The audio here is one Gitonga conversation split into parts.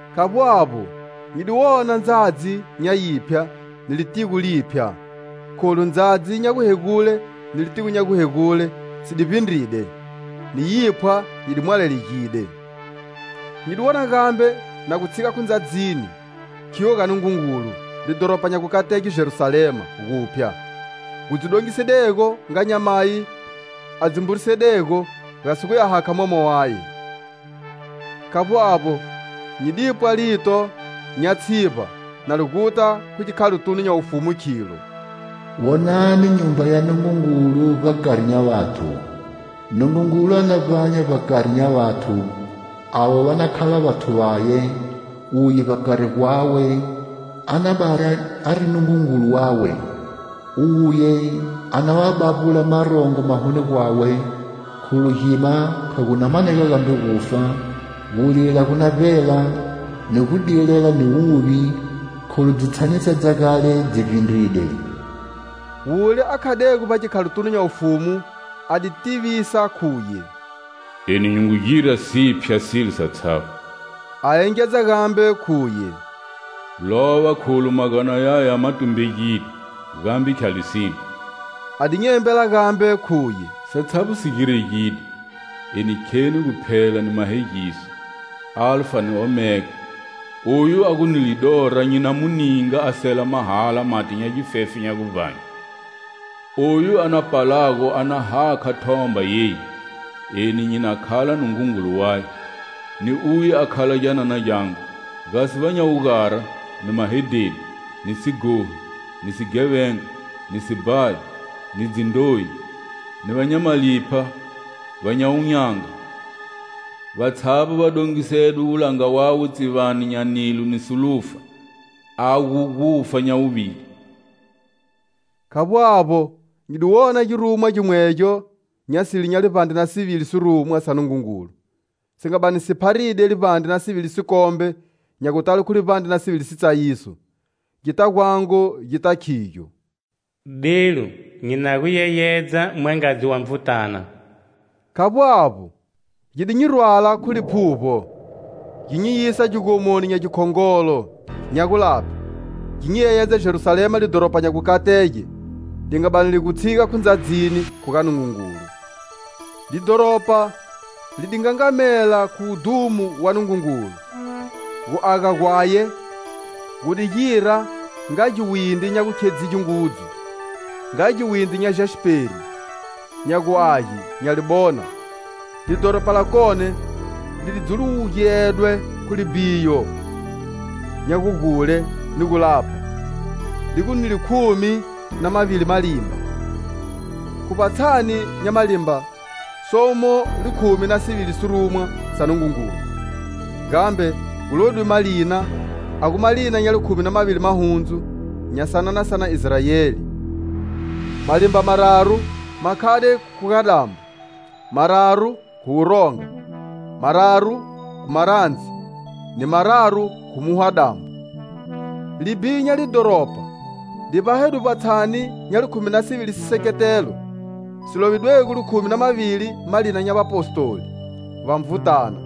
Khavbo avbo, nyi di wona Ndzadzi nya yiphya ni litigo liphya, kholu, ndzadzi nya guhegule ni litigo nya guhegule si di vbindride, ni yiphwa yi di mwalalegide. Nyi di wona gambe na gu tshiga khu ndzadzini, khiyo ga Nungungulu, lidhoropa nya gukatege, Jerusalema guphya, gu dzi dongisedego nga nyamayi a dzi mburisedego gasi guya hakha mwama waye. Khavbo avbo, nyi di pwa lito nya tshivba nali guta khu gikhalotunu nya wufumu, khilo: "Wonani nyumba ya Nungungulu vbakari nya vathu. Nungungulu a na vbanya vbakari nya vathu, avo va na khala vathu vaye, uye vbakari gwawe, a na bani ari Nungungulu wawe. Uye a na va bavbula marongo mahoni gwawe, kholu gima kha gu na manega gambe gufa, gulila gu na vbela, ni gudilela ni wuvi, kholu dzitshanisa dza gale dzi vbindride." Wule a khadego vbagikhalotunu nya wufumu a di tivisa khuye: "Eni nyi ngu gira siphya silo satshavbo." A engedza gambe khuye: "Lova kholu magana yaya ma tumbegide, gambe khya lisine." A di nyi embela gambe khuye: "Satshavbo si giregide! Eni kheni Guphela ni Mahegiso (Alfa ni Omega). Oyu a gu ni lidora nyi na mu ninga a sela mahala mati nya gifefe nya guvbanye. Oyu a na palago a na hakha thomba yeyi, eni nyi na khala Nungungulu waye, ni uye a khala gyanana gyangu. Gasi va nya wugara, ni mahedheni, ni sighohi, ni sighevenga, ni sibhayi, ni dzindroyi, ni va nya malipha, va nya wun'yanga, vatshavbo va dongisedwe wulanga wawe tsivani nya nilo ni solufa, a gu gufa nya wuvili." Khavbo avbo, nyi di wona girumwa gimwegyo nya sile nya livbandre na sivili sirumwa sa Nungungulu si nga bani si pharide livbandre na sivili sikombe nya gutale khu livbandre na sivili sitsayiso, gi dita gwangu gita khigyo: "Delu! Nyi na gu yeyedza Mwangadzi wa Nvutana." Khavbo avbo, gi di nyi rwala khu Liphuvbo gi nyi yisa gigomoni nya gikhongolo, nya gulaphe gi nyi yeyedza Jerusalema, lidhoropa nya gukatege, li nga bani li gu tshiga khu ndzadzini, khu ga Nungungulu. Lidhoropa li di ngangamela khu wudhumo wa Nungungulu. Gu aga gwaye gu di gira nga giwindri nya gukhedzige ngudzu nga giwindri nya jasperi nya gu age nga libona. Lidhoropa lakone li dzuwulugedwe khu libhiyo nya gugule ni gulapha, li gu ni likhumi na mavili malimba. Khu vbatshani nya malimba somo likhumi na sivili sirumwa sa Nungungulu, gambe gu lovidwe malina, a gu malina nya likhumi na mavili mahundzu nya sanana sa na Israeli. Malimba mararu ma khade khu khuga-dambo; mararu khu wuronga; mararu khu marandzi; ni mararu khu muhwa-dambo. Libhiyo nya lidhoropa li vbahedwe vbatshani nya likhumi na sivili siseketelo si lovidwego likhumi na mavili malina nya vapostoli va Nvutana.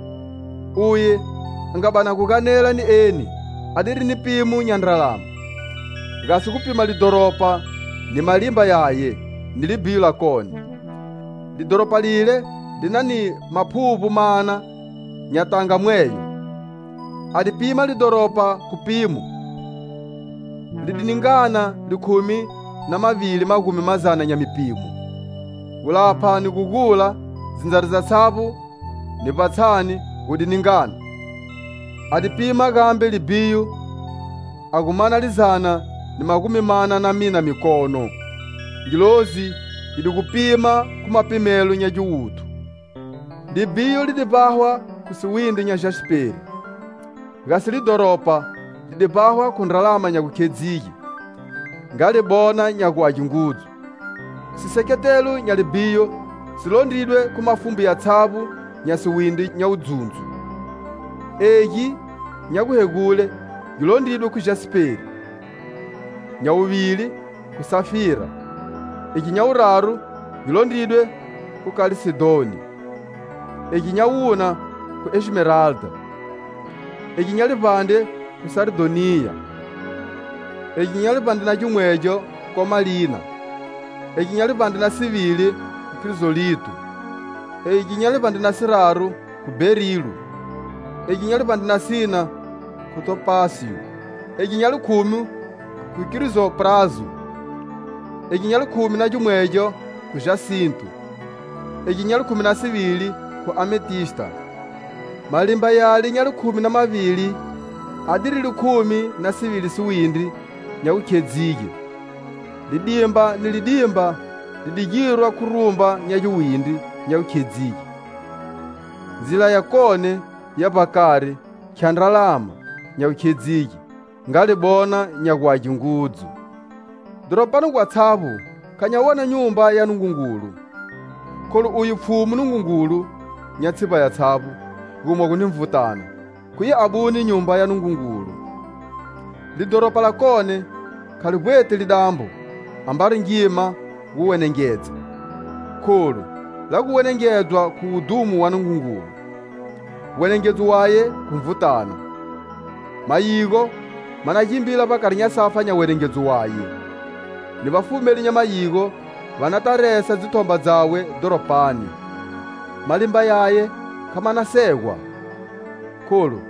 Uye a nga bani a gu ganela ni eni adiri ni pimo nya ndralama, gasi gu pima lidhoropa, ni malimba yaye ni libhiyo lakone. Lidhoropa leli li na ni maphuvbo mana nya tanga mweyo. A di pima lidhoropa khu pimo; li di ningana likhumi na mavili magumi mazana nya mipimo. Gulapha ni gugula, dzindzari dzatshavbo ni vbatshani gu ngu ningana. A di pima gambe libhiyo a gu mana lizana ni magumi mana na mina mikono. Ngilozi yi di gu pima khu mapimelo nya giwuthu. Libhiyo li di vbahwa khu siwindri nya jasperi, gasi lidhoropa li di vbahwa khu ndralama nya gukhedzige nga libona nya gu age ngudzu. Siseketelo nya libhiyo si londridwe khu mafumbu yatshavbo nya siwindri nya wuzundzo. Egi nya guhegule gi londridwe khu jasperi; nya wuvili khu safira, egi nya wuraru gi londridwe khu kalsedoni, egi nya wuna khu esmeralda; egi nya livbandre khu sardhoniya; egi nya livbandre na o khu komalina; egi nya livbandre na sivili khu krizolito; egi nya livbandre na siraru khu berilo; egi nya livbandre na sina khu topasiyo; egi nya likhumi khu krizoprazo; egi nya likhumi na gimwegyo khu jasinto; egi nya likhumi na sivili khu ametista. Malimba yale nya likhumi na mavili adiri likhumi na sivili siwindri nya gukhedzige, lidimba ni lidimba li di girwa khu rumba nya giwindri nya gukhedzige. Ndzila yakone ya vbakari khya ndralama nya gukhedzige nga libona nya gu age ngudzu. Dhoropani gwatshavbo kha nya wona nyumba ya Nungungulu. Kholu uye Pfhumu Nungungulu nya tshivba yatshavbo, gumogo ni Nvutana, khuye abune Nyumba ya Nungungulu. Lidhoropa lakone khali vbweti lidambo, ambari ngima gu wenengedza, kholu la gu wenengedzwa khu wudhumo wa Nungungulu, wenengedzo waye khu Nvutana. Mayigo ma na gimbila vbakari nya safa nya wenengedzo waye. Ni vafumeli nya mayigo va nata, va resa dzithomba dzawe dhoropani. Malimba yaye kha ma na segwa, kholu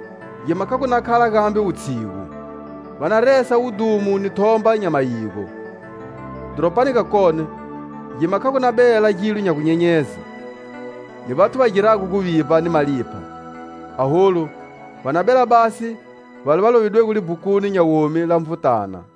gima kha gu na khala gambe wutshigu. Va na resa wudhumo ni thomba nya mayigo. Dhoropani gakone gima kha gu na bela gilo nya gunyenyeze, ni vathu va girago guvivba ni malipha; aholu va na bela basi vale va lovidwego libhukuni nya womi la Nvutana.